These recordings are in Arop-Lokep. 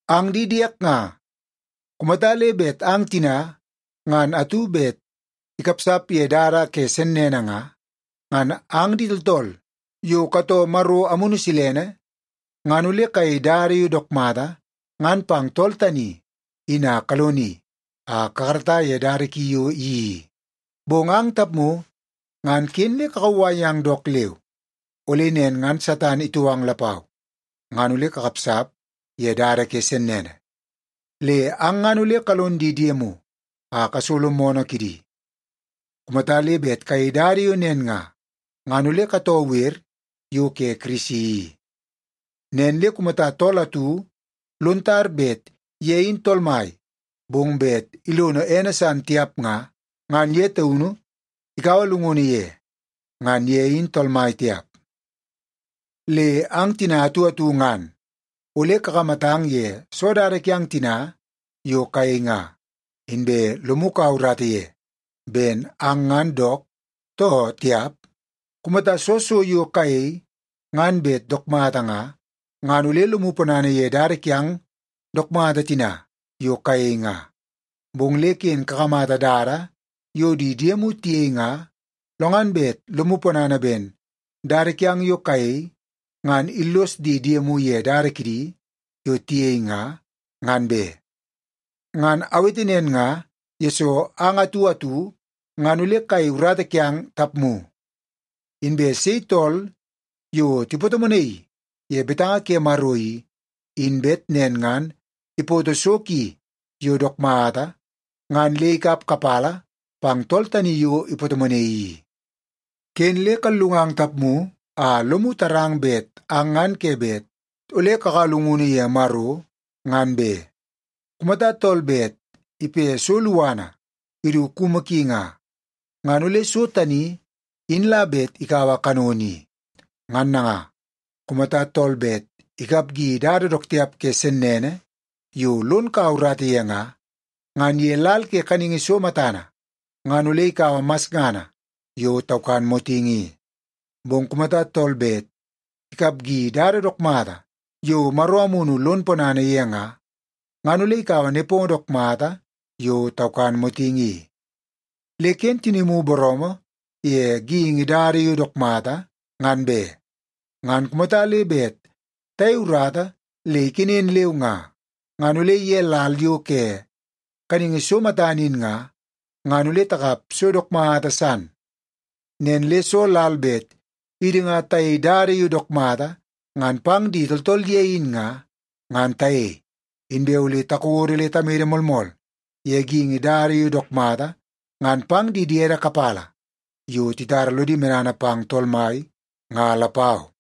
Ang di diek nga, kumata le bet ang tina ngan atu bet ikapsap ye dada ke sennene nga, ngan ang di tooltool yo katoo Maro Amunu Silene, ngan ole kayei dada yo dook mata ngan pang tool tani in a kaloni a kakarata ye dada ki yo iyeii i. Bong ang tapmu ngan ken le kakauwai yang dook leu, ole nen ngan Satan itou ang lapau ngan ole kakapsap ye dada ke sennene. Le ang ngan ole kalon di diemu a kasolo moonoo kidi. Kumata le bet kayei dada yo nen nga, ngan ole katoo wer yo ke Kirisi i. Nen le kumata tool atu lon tar bet ye in tool mai bong bet ilono ene san tiap nga, ngan ye taunu ikaua llungunu ye. Ngan ye in tool mai tiap. Le ang tina atu atu ngan ole kakamatang ye soo dada kiang tina yo kayei nga, inbe lomu kaua urata ye ben ang ngan dook too tiap. Kumata soo so yo kayei ngan bet dook mata nga, ngan ole lomu ponana ye dada kiang dook mata tina yo kayei nga. Bong le ken kakamata dada yo di diemu tiyei nga lo ngan bet lomu ponana ben dada kiang yo kayei ngan illos di diemu ye dada kidi yo tiyei nga, ngan be. Ngan awete nen nga, yesoo ang atu atu ngan ole kayei urata kiang tapmu. Inbe sei tool yo tipatomonaii ye betanga ke Maro i, in bet nen ngan ipoto so ki yo dook mata ngan le ikap kapala pang tool tani yo ipatomonaii i. Ken le kallungang tapmu a lomu tarang bet ang ngan ke bet ole kakaua llungunu ye Maro, ngan be. Kumata tool bet ipe so luana idu kumu ki nga, ngan ole so tani in la bet ikaua kanono i. Ngan nanga, kumata tool bet ikapgi dada dook tiap ke sennene yo lon kaua urata ye nga, ngan ye lal ke kaningi so matana ngan ole ikaua masngana yo taukan motingi i. Bong kumata tool bet ikapgi dada dook mata yo Maro Amunu lon ponana ye nga, ngan ole ikaua nepongo dook mata yo taukan motingi i. Le ken tinimu booroomoo ye geingi dada yo dook mata, ngan be. Ngan kumata le bet tayei urata le ikenen leu nga, ngan ole ye lal yo ke kaningi so matana in nga, ngan ole takap so dook mata san. Nen le soo lal bet idi nga tayei dada yo dook mata ngan pang di tooltool ye in nga, ngan tayei. Inbe ole takodo le tamede moolmool ye geingi dada yo dook mata ngan pang di diede kapala yo titara lodi medana pang Tool Mai nga lapau.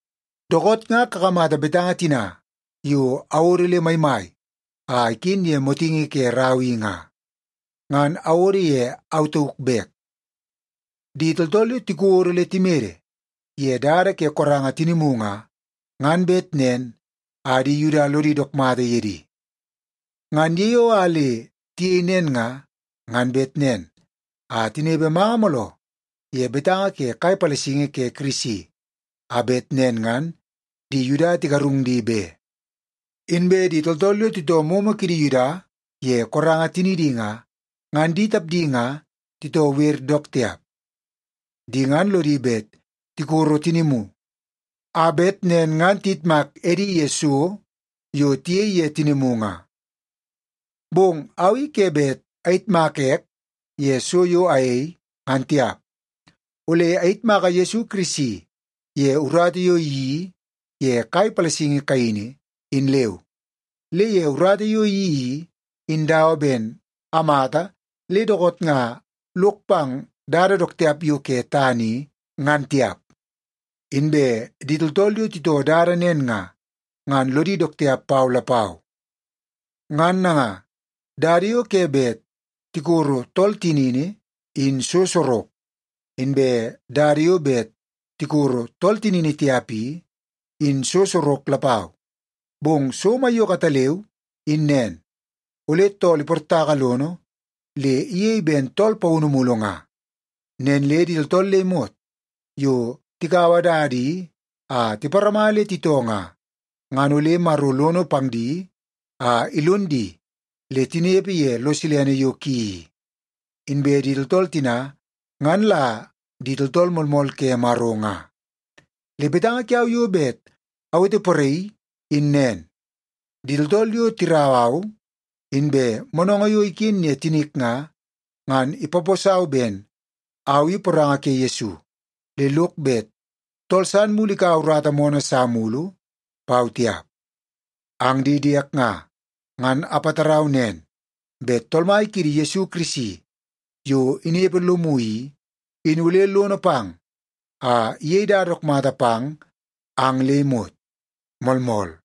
Dookoot nga kakamata betanga tina yo awodo le maimai a iken ye motingi ke rau i nga, ngan awodo ye au tauk bek. Di tooltool yo tikodo le timede ye dada ke koranga tinimu nga, ngan bet nen a di Yuda lodi dook mata ye di. Ngan ye yo a le tiyei nen nga, ngan bet nen a tinepe manga mooloo ye betanga ke kai palasingi ke Kirisi a bet nen ngan di Yuda tigarung di be. Inbe di tooltool yo titoo momo kidi Yuda ye koranga tinidi nga, ngan di tapdi nga titoo wer dook tiap. Di ngan lodi bet tikoro tinimu, a bet nen ngan tiyitmak edi ye so yo tiyei ye tinimu nga. Bong au i ke bet ayitmaka ek ye so yo ayei, ngan tiap. Ole ayitmaka Yesu Kirisi ye urata yo iyeii ye kai palasingi kaini, in leu. Le ye urata yo iyeii i, in dawa ben amata le dookoot nga lok pang dada dook tiap yo ke tana i, ngan tiap. Inbe di tooltool yo titoo dada nen nga, ngan lodi dook tiap pau lapau. Ngan nanga, dada yo ke bet tikoro tool tinini in so sorok, inbe dada yo bet tikoro tool tinini tiap i, in so sorok lapau. Bong so maiyoko ataleu in nen, ole tool iportaka lono le iyei ben tool paunu mulu nga. Nen le di tooltool le imot yo tikaua dada i a tiparama le titoo nga, ngan ole Maro lono pang di a ilon di le tinepe ye lo silene yo ki i. Inbe di tooltool tina, ngan la di tooltool moolmool ke Maro nga. Le betanga kiau yo bet aweteporaii in nen; di tooltool yo tirau au, inbe moonoongoo yo iken ye tinik nga, ngan ipaposau ben au i poranga ke Yesu le lok bet tool san mulu ikaua urata moonoo sa mulu pau tiap. Ang di diek nga, ngan apatarau nen bet Tool Mai kiidi Yesu Kirisi yo inepe lomu i, in ole lono pang a iyei dada dook mata pang ang le imot. Moolmool.